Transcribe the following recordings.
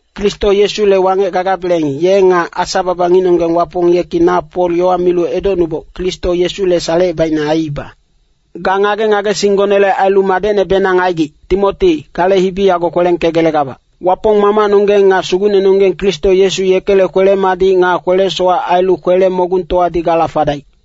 Kristo Yesule wangec gagabeleng, ye nga Asa-baba ngicnonggeng Wapong yeki na Pol yowa milu edocnuboc, Kristo Yesule salecebaicne aiiba. Ga ngage-ngagesinggonele ailu madecnebenang aigic, Timoti, gale hibi yago kwelengkegelegabac. Wapong Mamacnonggeng nga Sugucnenonggeng Kristo Yesu, yekele kwele-madic nga kwele-sowac ailu kwele-mogungtowadi gala fadaic.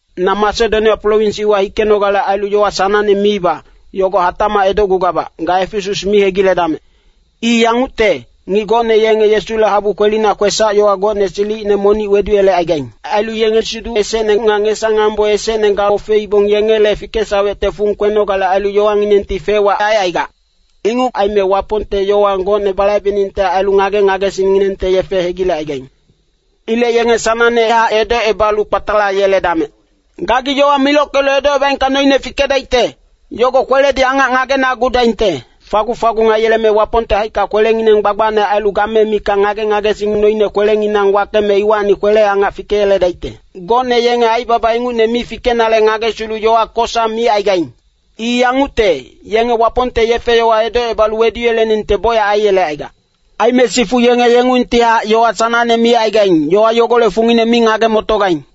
Na Masedonia prowins iwa hikenogale ailu yowa sanangne miiba, yogo hatacmac edocgugabac, ga Efesas mi hegiledamec. I yangucte, ngic gocne yenge Yesule habu kwelina kwesac-yowa gocne silicine monic weduyelecaigaing. Ailu yenge siduc esecne nga ngesa-ngambo esecne gaofeibong, yengele fikesawecte fung kwenogale ailu yowanginengti fec-wac aicaigac. Inguc aime Wapongte yowa gocne balaibeningte ailu ngage-ngagesingnginengte yefe hegilecaigaing. Ilec yenge sanangnehac edocebalu kpatalayeledamec. Gagi yowa milockelu edocebaengka noine fikedaicte, yogo kweledi angac ngagenagudaingte. Fagung-fagung aiyeleme Wapongte haicka kwelengineng gbagbacne ailu game mikac ngage-ngagesing noine kwesac mikac kwelenginang wakeme iwacni kwele-angac fikeyeledaicte. Gocne yenge aibaba ingucne mi fikenale ngagesilu yowa kosa micaigaing. I yangucte, yenge Wapongte yefe-yowa edocebalu weduyeleningte bocyac aiyelecaigac. Aime sifu yenge yengungtihac yowa sanangne micaigaing, yowa yogolec fungine mi ngage-motogaing.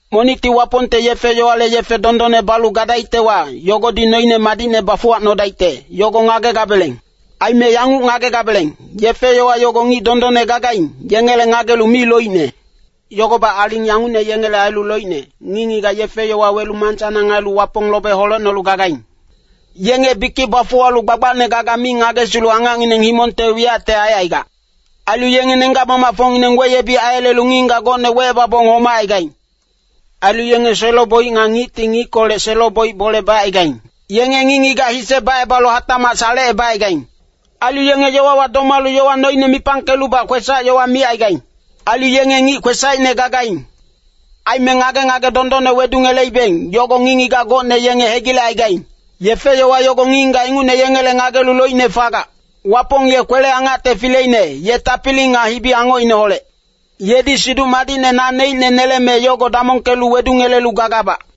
Monicti Wapongte yefe-yowale yefe dondonne balu gadaictewa, yogodi noine madicne bafuwacnodaicte, yogo ngagegabeleng. Aime yanguc ngagedabeleng, yefe-yowa yogo ngic dondonne gagaing, yengele ngagelu mi loicne. Yogobac aling yangucne yengele ailu loicne, ngic-ngigac yefe-yowa welu mansanang ailu Wapong lobe holecnolu gagaing. Yenge bikic bafuwalu gbagbacne gaga mi ngagesilu angacngineng himongte wiyacte aicaigac. Ailu yenge nenggac-mamacfocngineng weyebic aiyelelu ngic-ngigac gocne wecebabong homacaigaing. Ailu yenge selo-boic nga ngicti ngickolec selo-boic bole bacaigaing. Yenge ngic-ngigac hise bacebalu hatacmac salecebacaigaing. Ailu yenge yowawa domalu yowa noine mipangkelubac kwesac-yowa micaigaing. Ailu yenge ngic kwesacine gagaing. Aime ngage-ngage dondonne wedungeleibeng, yogo ngic-ngigac gocne yenge hegilecaigaing. Yefe-yowa yogo ngic-ngigac ingucne yengele ngagelu loicne fagac. Wapong ye kwele-angacte fileine, ye tapili nga hibi-angocineholec. Yedi Siduc Madicne naneicne neleme yogo damongkelu wedungelelu gagabac.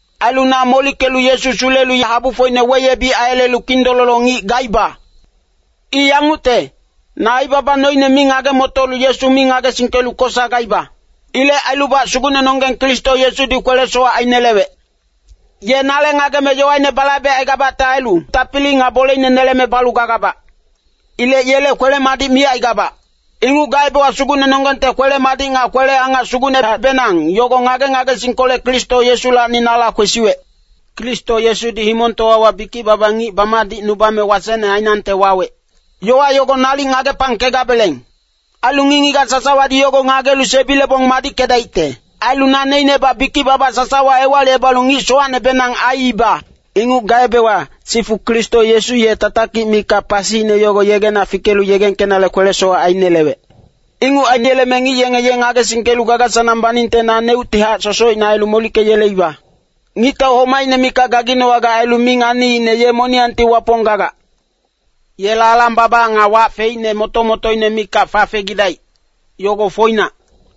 Ailu na molickelu Yesu sulelu habufocine weyebic aiyelelu kindololo ngic gaiba. I yangucte, na aibaba noine mi ngage-motolu Yesu mi ngagesingkelu kosa gaiba. Ilec ailubac Sugucnenonggeng Kristo Yesudi kwele-sowac ainelewec. Ye nale ngageme yowaine balaibecaigabacte ailu, tapili nga boleine neleme balu gagabac. Ilec yele kwele-madic micaigabac. Inguc gaebewa Sugucnenonggengte kwele-madic nga kwele-angac sugucnehacbenang, yogo ngage-ngagesingkolec Kristo Yesulacni nala kwesiwec. Kristo Yesudi himongtowawa bikic-baba ngic bamadicnubame wasecne ainangte wawec. Yowa yogo nalic ngagepangkedabeleng. Ailu ngic-ngigac sasawadi yogo ngagelu sebilebong madickedaicte. Ailu naneicnebac bikic-baba sasawa ewalicebalu ngic sowacnebenang aiiba. Inguc gaebewa, sifu Kristo Yesu ye tatakic mikac pasiine yogo yegena fikelu yegengkenale kwele-sowac ainelewec. Inguc aineleme ngic yenge ye ngagesingkelu gaga-sanang baningte naneuctihac sosocine ailu molickeyeleiba. Ngictau homacine mikac gaginowagac ailu mi nganiicne ye moniyangti Wapong gagac. Yela alang-baba nga wac feicne moto-motoine mikac fafegidaic, yogo foinac.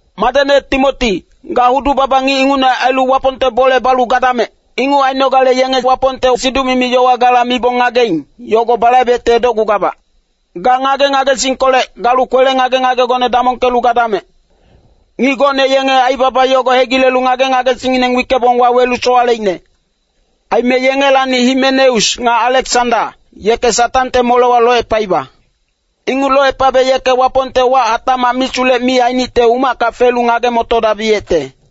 Madecne Timoti, ga hudu-baba ngic ingucne ailu Wapongte bole balu gadamec. Inguc ainogale yenge Wapongte siduc-yowa gala mibong ngageing, yogo balaibecte edocgugabac. Ga ngage-ngagesingkolec galu kwele ngage-ngagegone madicne damongkelu gadamec. Ngic gocne yenge aibaba yogo hegilelu ngage-ngagesingngineng wickebong wawelu sowaleicne. Aime yengelacni Himenaus nga Aleksanda, yeke Satangte molewa locepaiba. Inguc locepabe yeke Wapongte wac hatacmac misulec mi ainicte umacka felu ngage-motodabiyecte.